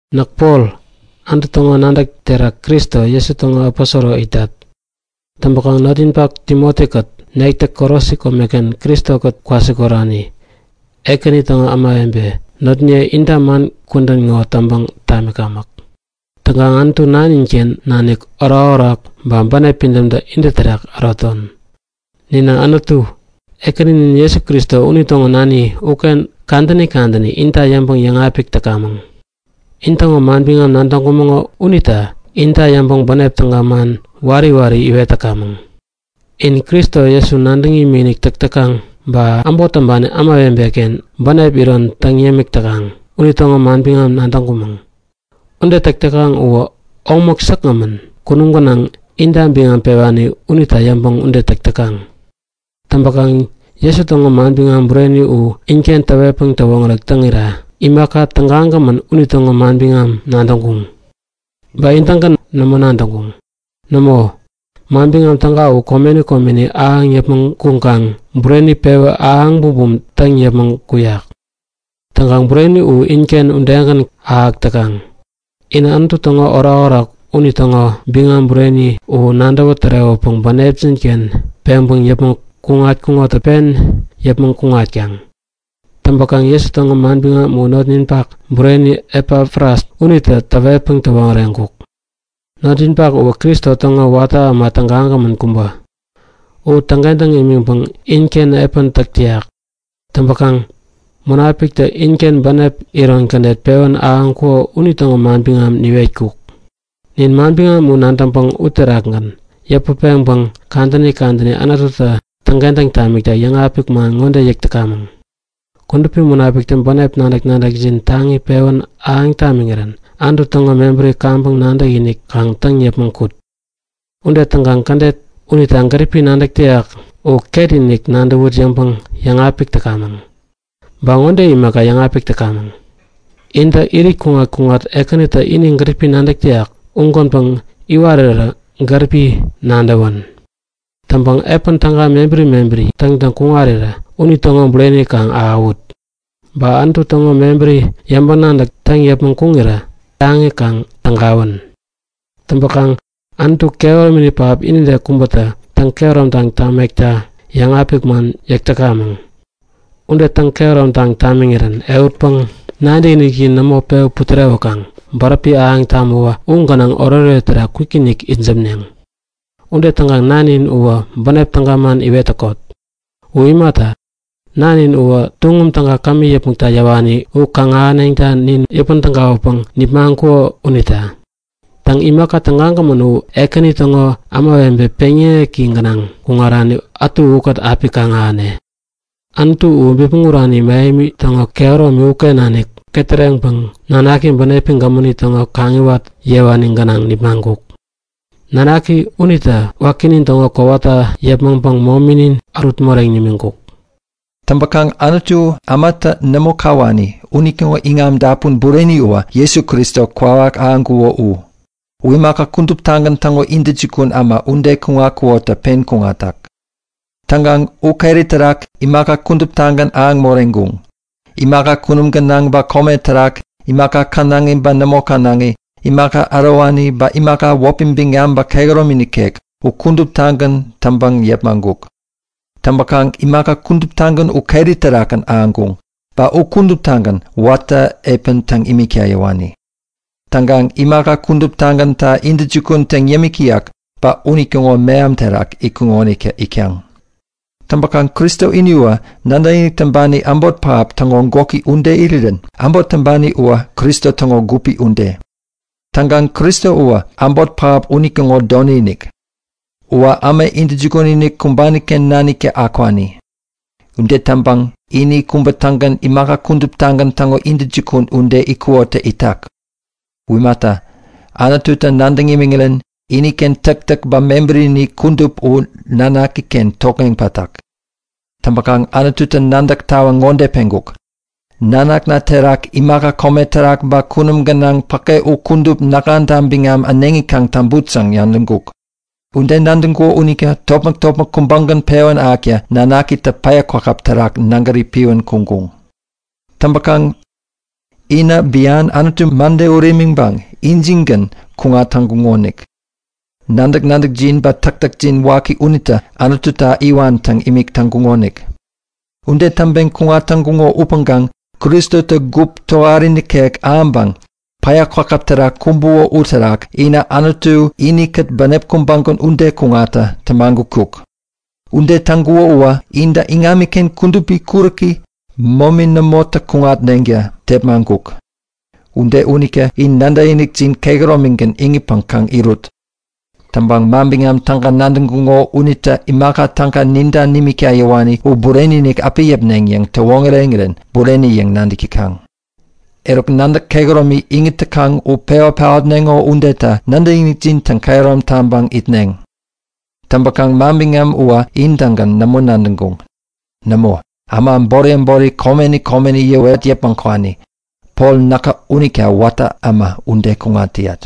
Näk Pol, Anutu täŋo nadäk terak Kristo Jesu täŋo aposoro itat. Täŋpäkaŋ notninpak Timoti-kät nektä Kolosi komeken Kristo-kät kwasikorani, Ekäni täŋo ämawebe notniye inta man kudän ŋo täŋpäŋ tamikamäk. Täŋkaŋ Anutu nanin-ken nanik orakorak ba bänep pidämtä intä terak äroton. Ninä Anutu, Ekäninin Jesu Kristo unitäŋo nani uken kadäni kadäni inta yäŋpäŋ yäŋapik täkamäŋ. In täŋo manbiŋam nadäŋkumäŋo unita inta yäŋpäŋ bänep täga man wari wari iwet täkamäŋ. In Kristo Jesu nadäŋ imikinik täk täkaŋ ba äbot täŋpani ämawebe-ken bänep iron täŋ yämik täkaŋ unitäŋo manbiŋam nadäŋkumäŋ. Ude täk täkaŋ uwä omäk tägagämän kunum gänaŋ inta biŋam pewani unita yäŋpäŋ ude täk täkaŋ. Täŋpäkaŋ Jesu täŋo manbiŋam bureni u inken täwetpäŋ täwoŋärek täŋirä imaka tägagämän unitäŋo manbiŋam nadäŋkuŋ. Ba in-tägän nämo nadäŋkuŋ. Nämo, Manbiŋam Täga u komeni komeni ahäŋ yäpmäŋ kuŋkaŋ bureni pewä ahäŋ bumbum täŋ yäpmäŋ kuyak. Täŋkaŋ bureni u inken udegän ahäk täkaŋ. Inä Anutu täŋo orakorak unitäŋo biŋam bureni u nadäwä tärewäpäŋ bänepjin-ken peŋpäŋ yäpmäŋ kuŋatkuŋotä pen yäpmäŋ kuŋat täkaŋ. Täŋpäkaŋ Jesu täŋo manbiŋam u notninpak bureni Epafras unitä täwetpäŋ täwoŋäreŋkuk. Notninpak uwä Kristo täŋo watä äma tägagämän kubä. U täŋkentäŋ nimiŋpäŋ inken epän täk täyak. Täŋpäkaŋ Munapiktä inken bänep iron kädet pewän ahäŋkuŋo unitäŋo manbiŋam niwetkuk. Nin manbiŋam u nadäŋpäŋ uterakgän yäput peŋpäŋ kadäni kadäni Anututä täŋkentäŋ tamikta yäŋapik man ŋode yäk täkamäŋ; Kudupi Munapiktä bänep nadäk-nadäkjin taŋi pewän ahäŋ tamiŋirän Anutu täŋo mebäri kaŋpäŋ nadäkinik kaŋ täŋ yäpmäŋ kut. Ude täŋkaŋ kädet unitä gäripi nadäk täyak u ketinik nadäwut yäŋpäŋ yäŋapik täkamäŋ. Ba ŋode imaka yäŋapik täkamäŋ; Intä irit kuŋat-kuŋat Ekänitä ini gäripi nadäk täyak ugänpäŋ iwarirä gäripi nadäwän. Täŋpäŋ epän täga mebäri mebäri täŋtäŋ kuŋarirä unitäŋo bureni kaŋ ahäwut. Ba Anutu täŋo mebäri yäŋpäŋ-nadäk täŋ yäpmäŋ kuŋirä taŋi kaŋ tägawän. Täŋpäkaŋ Anutu kehäromini pähap inide kubätä täŋ-kehäromtaŋ tamekta yäŋapik man yäk täkamäŋ. Ude täŋ-kehäromtaŋ tamiŋirän ehutpäŋ nadäkinikjin nämo pewä putärewäkaŋ bäräpi ahäŋ tamäwä u gänaŋ oretoret terak kwikinik itsämneŋ. Ude täŋkaŋ nanin uwä bänep täga man iwet täkot. U imata, Nanin uwä tuŋum täga kämi yäpmäkta yäwani u kaŋ-ahänetta nin yäpän-tägawäpäŋ nipmaŋkuko unita. Täŋ, imaka tägagämän u ekäni täŋo ämawebe peŋyäŋeki gänaŋ kuŋarani ätu ukät api kaŋ-ahäne. Anutu u bipmäŋ urani mähemi täŋo kehäromi-ken nanik ketäreŋpäŋ nanaki bänepi gämäni täŋo kaŋiwat yewani gänaŋ nipmaŋkuk. Nanaki unitä wakinin täŋo kowata yäpmäŋpäŋ mominin ärut moreŋ nimiŋkuk. Täŋpäkaŋ Anutu ämatä nämo kawani unitäŋo iŋam-dapun bureni uwä Jesu Kristo kwawak ahäŋkuko u. U imaka kuduptagän täŋo intäjukun äma ude kuŋatkukotä pen kuŋatak. Täŋkaŋ u keri terak imaka kuduptagän ahäŋ moreŋkuŋ. Imaka kunum gänaŋ ba kome terak, imaka känaŋi ba nämo känaŋi, imaka ärowani, ba imaka wäpi biŋam ba kehäromi nikek u kuduptagän täŋpäŋ yepmaŋkuk. Täŋpäkaŋ imaka kuduptagän u keri terakgän ahäŋkuŋ, ba u kuduptagän watä epän täŋ imikta yäwani. Täŋkaŋ imaka kuduptagänta intäjukun täŋ yämik täyak ba unitäŋo meham terak itkuŋotä itkaŋ. Täŋpäkaŋ Kristo ini uwä nadäkinik täŋpani äbot pähap täŋo gwäki ude irirän äbot täŋpani uwä Kristo täŋo gupi ude. Täŋkaŋ Kristo uwä äbot pähap unitäŋo doni-inik. Uwä äma intäjukun-inik kumbani-ken naniktä akwani. Ude täŋpäŋ ini kubä-tägän imaka kuduptagän täŋo intäjukun ude itkukotä itak. U imata, Anututä nadäŋ imiŋirän iniken täktäk ba mebärini kudup u Nanakiken tokŋeŋ pätak. Täŋpäkaŋ Anututä nadäk tawaŋ ŋode peŋkuk; Nanakna terak imaka kome terak ba kunum gänaŋ päke u kudup näkŋata biŋam äneŋi kaŋ täŋput yäŋ nadäŋkuk. Ude nadäŋkuko unita topmäk-topmäk kubägän pewän ahäkta nanakitä päya kwakäp terak nägäri piwän kuŋkuŋ. Täŋpäkaŋ inä bian Anutu mäde ut imiŋpäŋ injingän kuŋat täŋkuŋonik. Nadäk-nadäkjin ba täktäkjin waki unitä Anututa iwan täŋ imik täŋkuŋonik. Ude täŋpeŋ kuŋat täŋkuŋo upäŋkaŋ Kristotä gup tohari nikek ahäŋpäŋ päya kwakäp terak kumbuko uterak inä Anutu inikät bänep kubägän ude kuŋatta tämagutkuk. Ude täŋkuko uwä intä iŋamiken kudupi kuräki, momi nämotä kuŋatneŋta tepmaŋkuk. Ude unita in nadäkinikjin kehäromigän iŋitpäŋ kaŋ irut. Täŋpäŋ Manbiŋam Täga nadäŋkuŋo unitä imaka täga ninta nimikta yäwani u bureni-inik api yäpneŋ yäŋ täwoŋäreŋirän bureni yäŋ nadäk täkaŋ. Eruk nadäk kehäromi iŋit täkaŋ u pewä paotneŋo udeta nadäkinikjin täŋkehärom taŋpäŋ itneŋ. Täŋpäkaŋ manbiŋam uwä in-tägän nämo nadäŋkuŋ. Nämo, äma äbori äbori komeni komeni yäwet yäpmäŋ kwani. Pol näkä unita watä äma ude kuŋat täyat.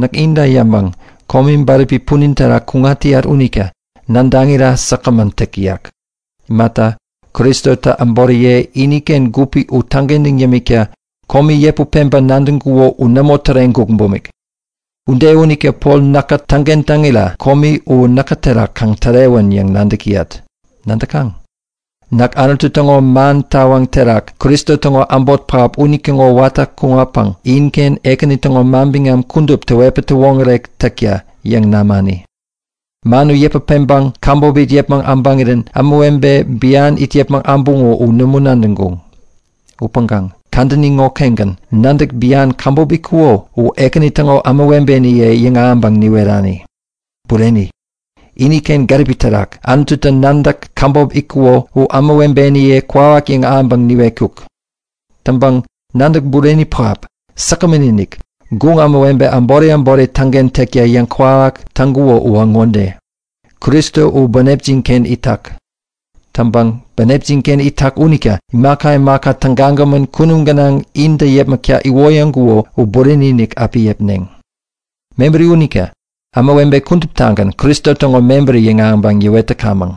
Näk inta yäŋpäŋ komi bäräpi punin terak kuŋat täyat unita nadäŋira säkgämän täk täyak. Imata, Kristotä äboriye, iniken gupi u täŋkentäŋ yämikta komi yäput peŋpäŋ nadäŋkuko u nämo täreŋkuk bumik. Ude unita Pol näkä täŋkentäŋira komi u näkä terak kaŋ tärewän yäŋ nadäk täyat. Nadäkaŋ? Näk Anutu täŋo man tawaŋ terak Kristo täŋo äbot pähap unitäŋo watä kuŋatpäŋ inken Ekäni täŋo manbiŋam kudup täwetpäŋ täwoŋärek täkta yäŋ namani. Man u yäput peŋpäŋ käbop it yäpmäŋ äbäŋirän ämawebe bian it yäpmäŋ äbuŋo u nämo nadäŋkuŋ. Upäŋkaŋ kadäni ŋokengän nadäk bian käbop itkuko u Ekäni täŋo ämawebeniye yäŋahäŋpäŋ niwerani. Bureni, iniken gäripi terak Anututä nadäk käbop itkuko u ämawebeniye kwawak yäŋahäŋpäŋ niwetkuk. Täŋpäŋ nadäk bureni pähap, säkgämän-inik, guŋ ämawebe äbori äbori täŋkentäkta yäŋkwawak täŋkuko uwä ŋode; Kristo u bänepjin-ken itak. Täŋpäŋ bänepjin-ken itak unita imaka imaka tägagämän kunum gänaŋ intä yäpmäkta iwoyäŋkuko u bureni-inik api yäpneŋ. Mebäri unita ämawebe kuduptagän Kristo täŋo mebäri yäŋahäŋpäŋ yäwet täkamäŋ.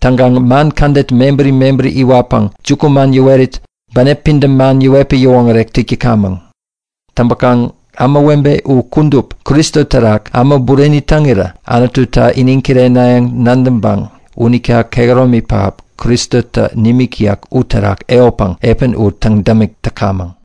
Täŋkaŋ man kädet mebäri mebäri iwatpäŋ jukuman yäwerit, bänep pidäm man yäwetpäŋ yäwoŋärek täk täkamäŋ. Täŋpäkaŋ ämawebe u kudup Kristo terak äma bureni täŋirä Anututa iniŋ kirenayäŋ nadäŋpäŋ unita kehäromi pähap Kristotä nimik täyak uterak ehutpäŋ epän u täŋ-dämik täkamäŋ.